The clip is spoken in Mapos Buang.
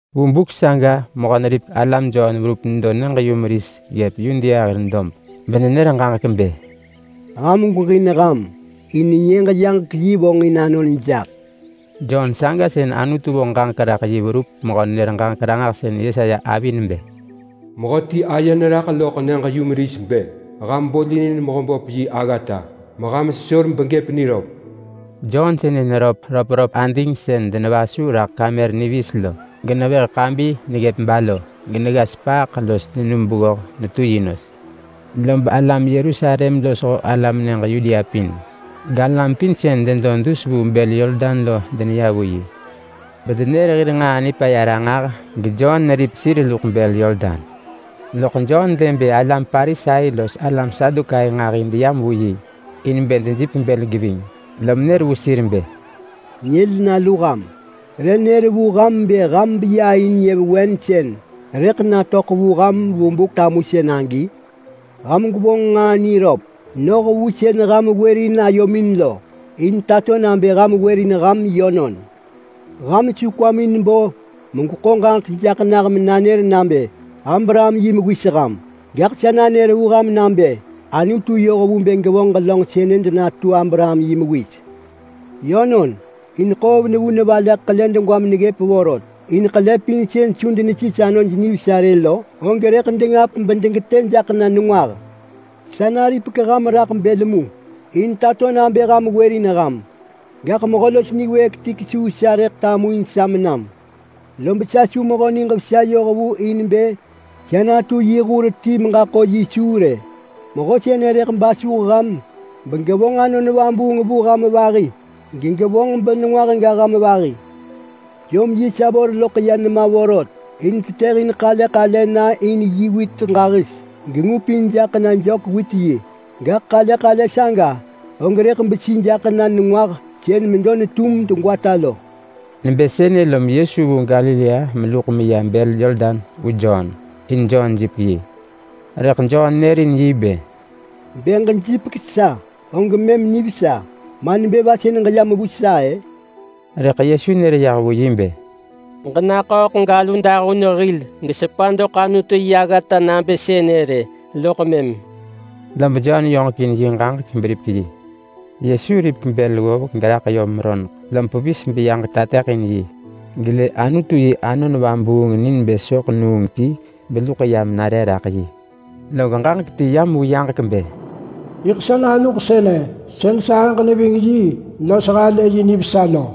Vu buk saga mehö-neripek-alam Jon verup nedo nyëġ-yumeris ggëp Yudea hir dob, benenër ġaġek bë, “Ham gweġin ham in Nyëġ-yaġek-yi vonġin anon jaḳ.” Jon saga sën Anutu vonġ ġaġek raḳ yi verup mehö-nenër-ġaġek-ranġahsën Yesaya avi nebë: “Mehöti aye neraḳ loḳ nyëġ-yumeris bë, ‘Ham bolinin Mehöböp yi aggata, meham sesor begëp niröp.’” Jon sënë neröp röpröp ading sën denevasu raḳ kamër niviis lo, genevëh ḳabi neggëp balo. Genegga sepaaḳ los nenum beggoh netu yi nos. Lob alam Yerusalem losho alam nyëġ Yudea pin, galam pin sën denedo dus vu bël Yordan lo deneya vu yi. Bedenër hir nġaa nipaya ranġah geJon neripek sir luḳ bël Yordan. Loḳ Jon lë bë alam Parisai los alam Sadukai nġahi deyam vu yi in bë dejipek bël geving, lom nër vu sir bë, “Nyël nalu ham! Re nër vu ham bë ham beya in nyëvewen sën rëḳ natöḳ vu ham vu buk tamusën agi? Ham gwevonġ nġaa niröp noh vu sën ham wërin ayomin lo, in tato nabë ham wërin ham yönon. Ham su kwamin bo megweḳo ġaġek jaḳ nah menanër nabë Abraham yi mewis ham. Gaḳ sa nanër vu ham nabë Anutu yoh vu bë gevonġ ġelönġ sënë denatu Abraham yi mewis. Yönon, in ḳoov nevu nevaleḳ ḳele ġeġa meneggëp vorot, in ḳele pin sën su denesis anoj nivesa rë lo, saga rëḳ dengap bedegetë jaḳ na nengwah. Sa naripek ham raḳ bël mu, in bë ham gwërin ham. Gaḳ mehö los niwëëk ti kesuu sa rëḳ tamuin sa menam, lob sa su mehö niġ vesa yoh vu in bë sa natu yi hur ti menaḳah vaha suu vër rë. Mehö sënë rëḳ basuh ham begevonġ Anon Vabuung vu ham vahi gegevonġ benengwah ga ham vahi. Jom yi savor loḳ ya nema vorot in tetëhin ḳale ḳale na in yi wit ġahis, gengupin jaḳ na jök-wit-yi. Gaḳ ḳale ḳale saga, og rëḳ besi jaḳ na nengwah sën medo netum degwata lo.” Nebë sënë lob Yesu vu Galilea meluḳ meya bël Yordan vu Jon, in bë Jon jipek yi. Rëḳ Jon nërin yi bë, “Bë ġejipek sa og mëm nivesa, ma nebë va sën ġeyam vu sa-ë?” Rëḳ Yesu nër yah vu yi bë, “Ġenaḳööḳ galu dahun hil gesepa doḳ Anutu yi aggata nabë sënë rë loḳ mëm.” Lob Jon yoġekin yi ġaġek beripek yi. Yesu ripek bël ggovek geraḳ yom roneḳ, lob pevis beyaġek tateḳin yi, gelë Anutu yi Anon Vabuung ni nebë soḳ nuung ti beluḳ yam nare raḳ yi. Log ġaġek ti yam vu yaġek bë, “Yiḳ sa naluġ sënë sën sahëġ neving yi los halë yi nivesa lo!”